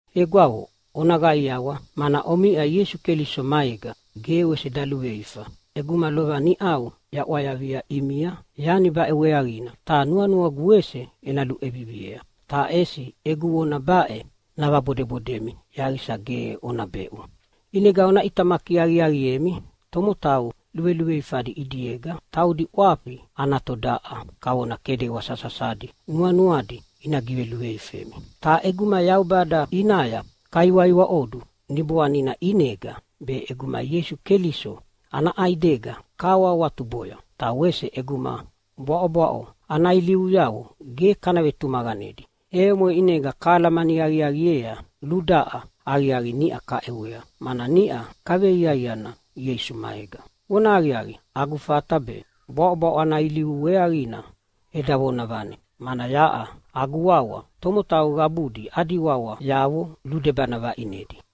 Egwavo, ona qaiawa, mana omiʼa Ieisu Keliso maega! Ge wese daluveifa ʼeguma lova niʼau yaʼwayavia ʼimia yani baʼe weaqina ta nuanuagu wese ena luʼeviviea. Ta ʼesi egu vona baʼe navabodebodemi yaqisa ge ona beʼu. ʼInega ona ʼitamaki aqiaqiemi tomotau luveluveifadi ʼidiega. Taudi ʼwafi ana todaʼa kavona kedewa sasasadi nuanuadi ina giveluveifemi Ta ʼeguma Yaubada ʼinaya kaiwaiwaʼodu Niboanina ʼinega be, ʼeguma Ieisu Keliso ana ʼaidega kahawahawatuboya, ta wese ʼeguma bwaʼobwaʼo ana ilivuyavo ge kana vetumaqanedi, e omoʼe ʼinega kahalamani aqiaqiea ludaʼa aqiaqi niʼa kaʼewea, mana niʼa kaveiaiana Ieisu maega. Vonahaqiaqi, agu fata be bwaʼobwaʼo ana ilivu weaqina eda vonavane, mana yaʼa agu wawa tomotau qabudi adi wawayavo ludebana vaʼinedi.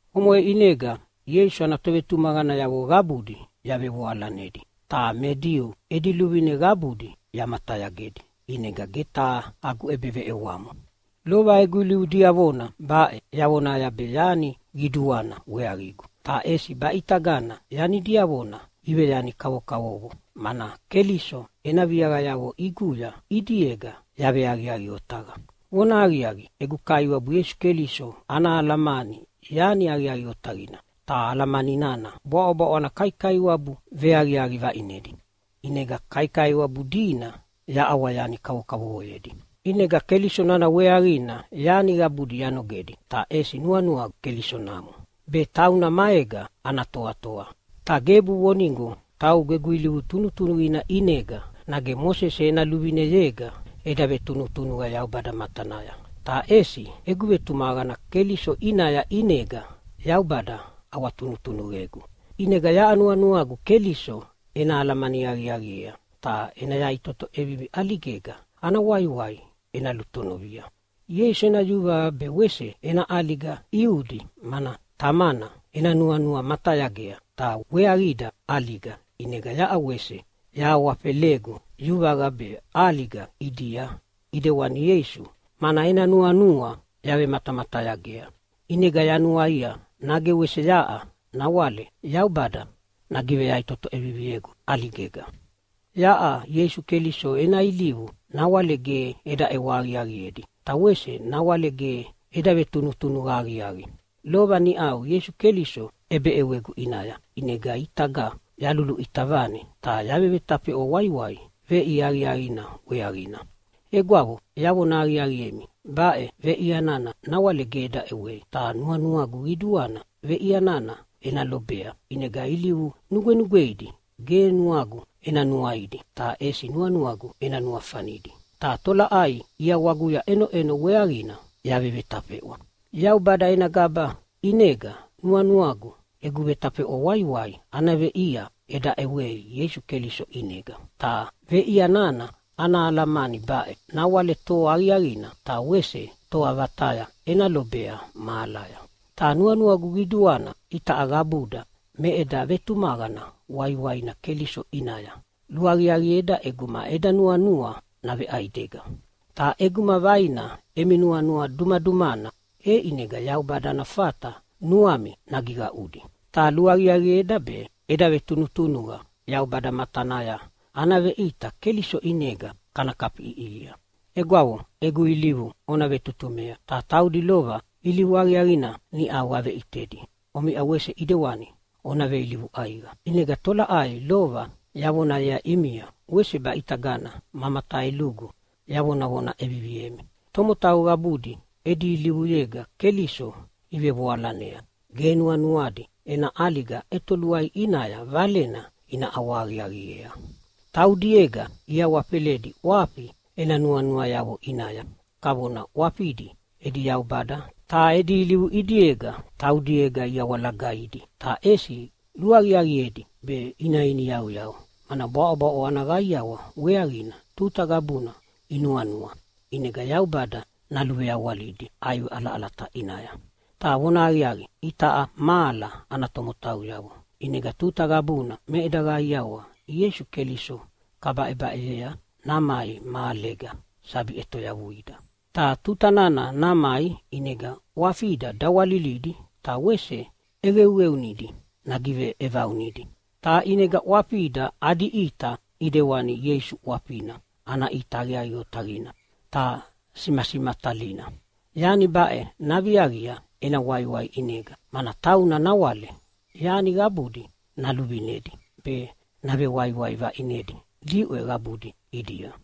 Omoʼe ʼinega Ieisu ana tovetumaqanayavo qabudi yavevoalanedi. Ta me Diu edi luvine qabudi yamatayagedi, ʼinega ge taha agu ʼebeveʼewamo. Lova egu ilivu diavona baʼe yavonaya be yani qiduana weaqigu. Ta ʼesi baʼitagana yani diavona iveyani kavokavovo, mana Keliso ena viaqayavo ʼiguya ʼidiega yaveaqiaqi otaqa. Vonahaqiaqi, egu Kaiwabu Ieisu Keliso ana alamani yani aqiaqi otaqina, ta alamani nana bwaʼobwaʼo ana kaikaiwabu veaqiaqi vaʼinedi. ʼInega kaikaiwabu dina yaʼawa yani kavokavovoyedi. ʼInega Keliso nana weaqina yani qabudi yanogedi. Ta ʼesi nuanuagu Keliso namo, be tauna maega ana toatoa. Ta gebu vonigo taugu egu ilivu tunutunuqina ʼinega nage Mosese ena luvineyega eda vetunutunuqa Yaubada matanaya. Ta ʼesi egu vetumaqana Keliso ʼinaya ʼinega Yaubada ʼawatunutunuqegu. ʼInega yaʼa nuanuagu Keliso ena alamani aqiaqiea, ta ena yaʼitoto ʼevivi ʼaligega ana waiwai ena lutonovia. Ieisu ena yuvaqa be wese ena ʼaliga ʼiudi mana Tamana ena nuanua matayagea ta weaqida ʼaliga. ʼInega yaʼa wese yahawafelegu yuvaqa be ʼaliga ʼidia ʼidewani Ieisu, mana ena nuanua yavematamatayagea. ʼInega yanuaia nage wese yaʼa nawale Yaubada nagiveyaʼitoto ʼeviviegu ʼaligega. Yaʼa Ieisu Keliso ena ilivu nawale ge eda ʼewa aqiaqiedi, ta wese nawale ge eda vetunutunuqa aqiaqi. Lova niʼau Ieisu Keliso ʼebeʼewegu ʼinaya, ʼinega ʼitaga yaluluʼita vane ta yavevetafeʼwa waiwai veʼia aqiaqina weaqina. Egwavo, yavona aqiaqiemi baʼe veʼia nana nawale ge eda ʼewei. Ta nuanuagu qiduana veʼia nana ena lobea. ʼInega ilivu nugwenugweidi ge nuagu ena nuaidi ta ʼesi nuanuagu ena nuafanidi, ta tolaʼai ʼiawaguya ʼenoʼeno weaqina yavevetafeʼwa. Yaubada ena gaba ʼinega nuanuagu egu vetafeʼwa waiwai ana veʼia eda ʼewei Ieisu Keliso ʼinega. Ta veʼia nana ana alamani baʼe: Nawale toa aqiaqina ta wese toa vataya ena lobea mahalaya. Ta nuanuagu qiduana itaʼa qabuda me eda vetumaqana waiwaina Keliso ʼinaya luaqiaqieda ʼeguma eda nuanua naveʼaidega. Ta ʼeguma vaina emi nuanua dumadumana, e ʼinega Yaubada ana fata nuami nagiqaʼudi. Ta luaqiaqieda be eda vetunutunuqa Yaubada matanaya ana veʼita Keliso ʼinega kana kafiʼiʼihia. Egwavo, egu ilivu ona vetutumea, ta taudi lova ilivu aqiaqina niʼau aveʼitedi omiʼa wese ʼidewani ona veilivu ʼaiqa. ʼInega tolaʼai lova yavonayea ʼimia wese baʼitagana ma mataelugu yavonavona ʼeviviemi. Tomotau qabudi edi ilivuyega Keliso ivevoalanea. Ge nuanuadi ena ʼaliga ʼetoluai ʼinaya valena ina ʼawahaqiaqiea. Taudiega iawafeledi ʼwafi ena nuanuayavo ʼinaya, kavona ʼwafidi edi yaubada. Ta edi ilivu ʼidiega taudiega iawalagaidi, ta ʼesi luaqiaqiedi be ina iniyauyau, mana bwaʼobwaʼo ana qaiawa weaqina tuta qabuna inuanua. ʼInega Yaubada naluveawalidi ʼaiwe ʼalaʼalata ʼinaya. Ta vonahaqiaqi, itaʼa mahala ana tomotauyavo, ʼinega tuta qabuna me eda qaiawa Ieisu Keliso kabaʼebaʼeyea namai mahalega sabi ʼetoyavuida. Ta tuta nana namai ʼinega ʼwafida dawalilidi ta wese ʼeqeuqeunidi nagiveʼevaunidi, ta ʼinega ʼwafida adi ʼita ʼidewani Ieisu ʼwafina ana ʼita aqiaqi otaqina ta simasimatalina. Yani baʼe naviaqia ena waiwai ʼinega, mana tauna nawale yani qabudi naluvinedi be navewaiwai vaʼinedi diʼwe qabudi ʼidia.